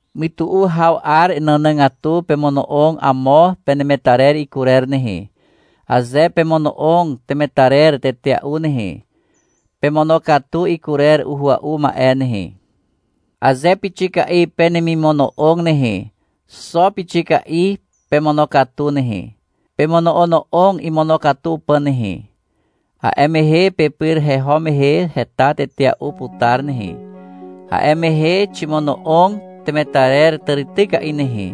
Mytu'u haw 'ar nànàgatu pemono'og amo penemetarer ikurer nehe. Aze pemono'og temetarer tetea'u nehe, pemonokatu ikurer uhua'u ma'e nehe. Aze pixika'i penemimono'og nehe, xo pixika'i pemonokatu nehe. Pemono'ono'og imonokatu pà nehe. A'e mehe pepyr heho mehe heta tetea'u putar nehe. A'e mehe — Ximono'og temetarer tàrityka'i nehe,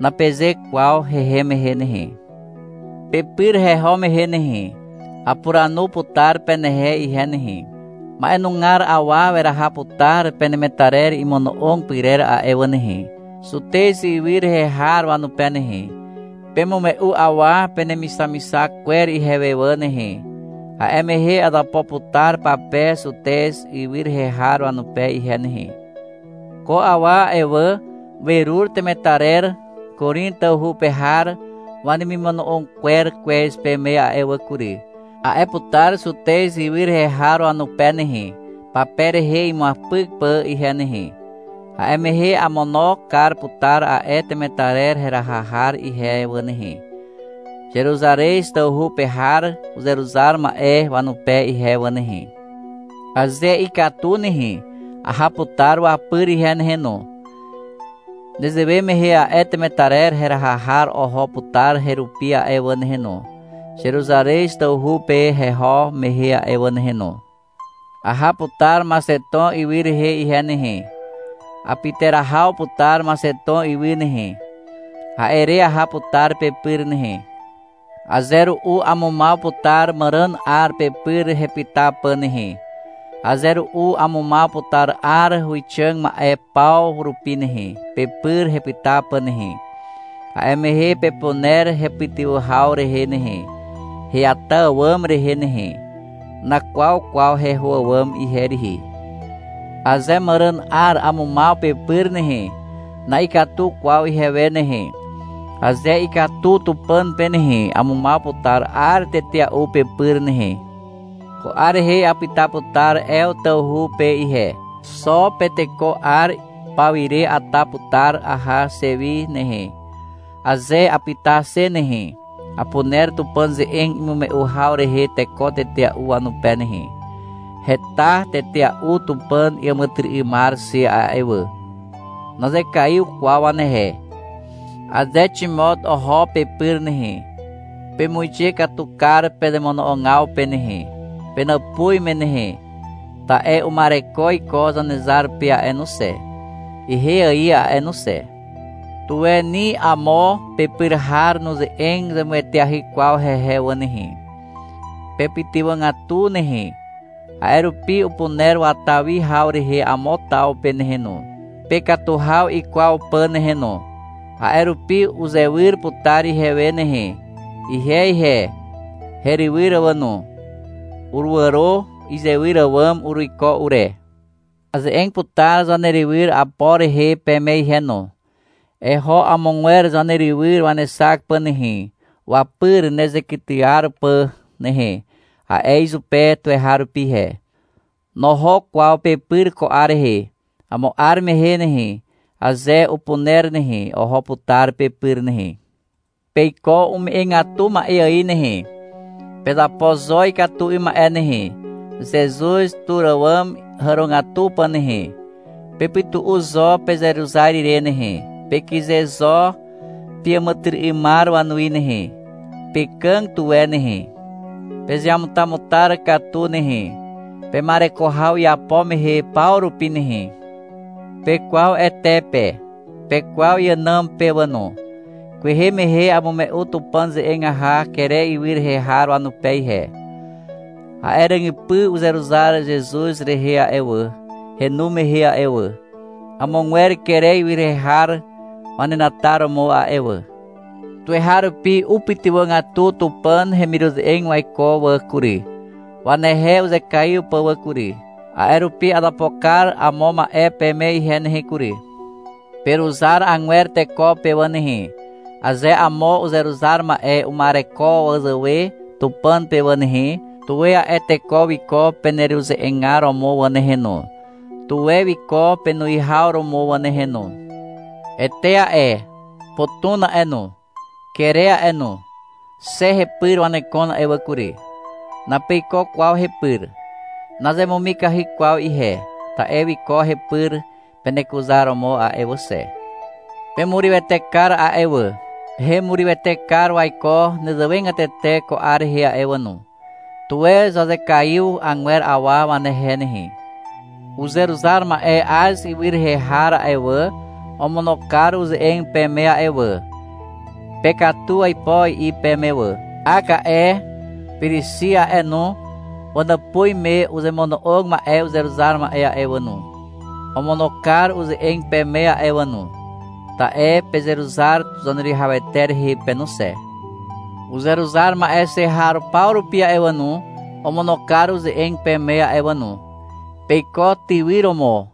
napeze kwaw hehem mehe nehe. Pepyr heho mehe nehe, apuranu putar penehe ihe nehe. -Ma'enugar awa weraha putar penemetarer imono'og pyrer a'e wà nehe, Zutez ywy rehe har wanupe nehe. Pemume'u awa penemixamixak kwer ihewe wà nehe. A'e mehe azapo putar pape Zutez ywy rehe har wanupe ihe nehe. — Ko awa a'e wà, werur temetarer Korin tawhu pe har wanemimono'og kwer kwez peme a'e wà kury, a'e putar Zutez ywy rehe har wanupe nehe, pape rehe imuapyk pà ihe nehe. A'e mehe amono kar putar a'e temetarer heraha har ihe wà nehe, Zeruzarez tawhu pe har uzeruzar ma'e wanupe ihe wà nehe. Aze ikatu nehe, aha putar wapyr ihe nehe no. Nezewe mehe a'e temetarer heraha har oho putar herupi a'e wà nehe no, Zeruzarez tawhu pe heho mehe a'e wà nehe no. Aha putar Maxeton ywy rehe ihe nehe. Apyterahaw putar Maxeton ywy nehe. A'e re aha putar pepyr nehe. Aze ru'u amumaw putar màràn 'ar pepyr hepyta pà nehe. Aze ru'u amumaw putar 'ar huwixàg ma'e paw rupi nehe, pepyr hepyta pà nehe. A'e mehe pepuner hepytywà haw rehe nehe, heata àwàm rehe nehe. Nakwaw kwaw heho àwàm ihe rihi. Aze màràn 'ar amumaw pepyr nehe, na'ikatu kwaw ihewe nehe. Aze ikatu Tupàn pe nehe, amumaw putar 'ar tetea'u pepyr nehe. Ko 'ar rehe apyta putar Ew tawhu pe ihe. Xo Penteko 'ar pawire ata putar aha xe wi nehe. Aze apyta xe nehe, apuner Tupàn ze'eg imume'u haw rehe teko tetea'u wanupe nehe. Heta tetea'u Tupàn iàmàtyry'ymar xe a'e wà. Nazekaiw kwaw wanehe. Aze Ximot oho pepyr nehe, pemuixe katu kar pezemono'ogaw pe nehe, penàpuz me nehe. Ta'e uma'ereko iko Zanezar pe a'e no xe, ihe ài a'e no xe. Tuwe ni amo pepyr har nuze'eg zemueteahy kwaw hehe wà nehe. Pepytywàgatu nehe. A'e rupi upuner wata wi haw rehe amo taw pe nehe no, pekatu haw ikwaw pà nehe no. A'e rupi uzewyr putar ihewe nehe. Ihe ihe, herywyr wà no, uruàro izewyr àwàm uruiko ure. Aze'eg putar zanerywyr Apor rehe peme ihe no. — Eho amogwer zanerywyr wanexak pà nehe, wapyr nezekytyar pà nehe, a'e izupe tuweharupi ihe. Noho kwaw pepyr ko 'ar rehe. Amo 'ar mehe nehe, aze upuner nehe, oho putar pepyr nehe. Peiko ume'egatu ma'e ài nehe. Pezapo zo ikatu 'ym ma'e nehe, Zezuz tur àwàm hàrogatu pà nehe. Pepytu'u zo pezeruzar ire nehe, pekyze zo peàmàtyry'ymar wanuwi nehe, pekàg tuwe nehe. Pezeamutamutar katu nehe, pema'ereko haw iapo mehe paw rupi nehe. Pekwaw Ete pe, pekwaw iànàm pe wà no. Kwehe mehe amume'u Tupàn ze'eg aha Kere ywy rehe har wanupe ihe. A'e ràgypy uzeruzar Zezuz rehe a'e wà, henu mehe a'e wà, amogwer Kere ywy rehe har wanenataromo a'e wà. Tuweharupi upytywàgatu Tupàn hemiruze'eg waiko wà kury, wanehe uzekaiw pà wà kury. A'e rupi azapo kar amo ma'e peme ihe nehe kury. Peruzar agwer teko pe wà nehe. Aze amo uzeruzar ma'e uma'ereko wazàwe Tupàn pe wà nehe, tuwe a'e teko wiko peneruze'egar romo wà nehe no, tuwe wiko penuwihaw romo wà nehe no. Ete a'e, Potuna a'e no, Kere a'e no, xe hepyr wanekon a'e wà kury. Napeiko kwaw hepyr. Nazemumikahy kwaw ihe, ta'e wiko hepyr penekuzaromo a'e wà xe. Pemurywete kar a'e wà. Hemurywete kar waiko nezewegatete ko 'ar rehe a'e wà no. Tuwe zazekaiw agwer awa wanehe nehe. Uzeruzar ma'e Az ywy rehe har a'e wà, omono kar uze'eg peme a'e wà, — Pekatu aipo, i'i peme wà. Ak a'e, Pirixi a'e no, wanàpuz me uzemono'og ma'e uzeruzar ma'e a'e wà no, omono kar uze'eg peme a'e wà no. Ta'e pezeruzar Zaneruwihawete rehe pe no xe. Uzeruzar ma'e xe har paw rupi a'e wà no, omono kar uze'eg peme a'e wà no. Peiko tywyr romo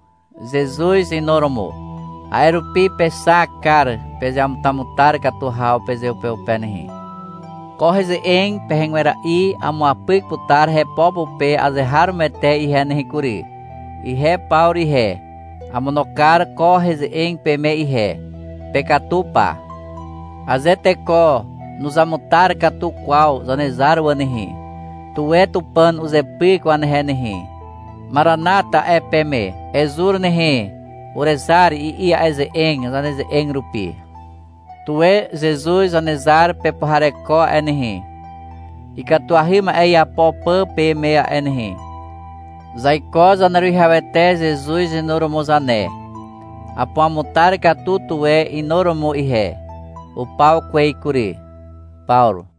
Zezuz inuromo. A'e rupi pexak kar pezeamutamutar katu haw pezeupeupe nehe. Ko heze'eg pehegwera'i amuapyk putar hepo pupe azeharomoete ihe nehe kury. Ihe Pawru ihe, amono kar ko heze'eg peme ihe. Pekatu pa. Aze teko nuzamutar katu kwaw Zanezar wà nehe, tuwe Tupàn uzepyk wanehe nehe. MARANATA, a'e peme. — Ezur nehe, urezar, i'i a'e ze'eg zaneze'eg rupi. Tuwe Zezuz Zanezar pepuhareko a'e nehe, ikatuahy ma'e iapo pà peme a'e nehe. Zaiko Zaneruwihawete Zezuz inuromo zane. Apuamutar katu tuwe inuromo ihe. Upaw kwez kury. Pawru.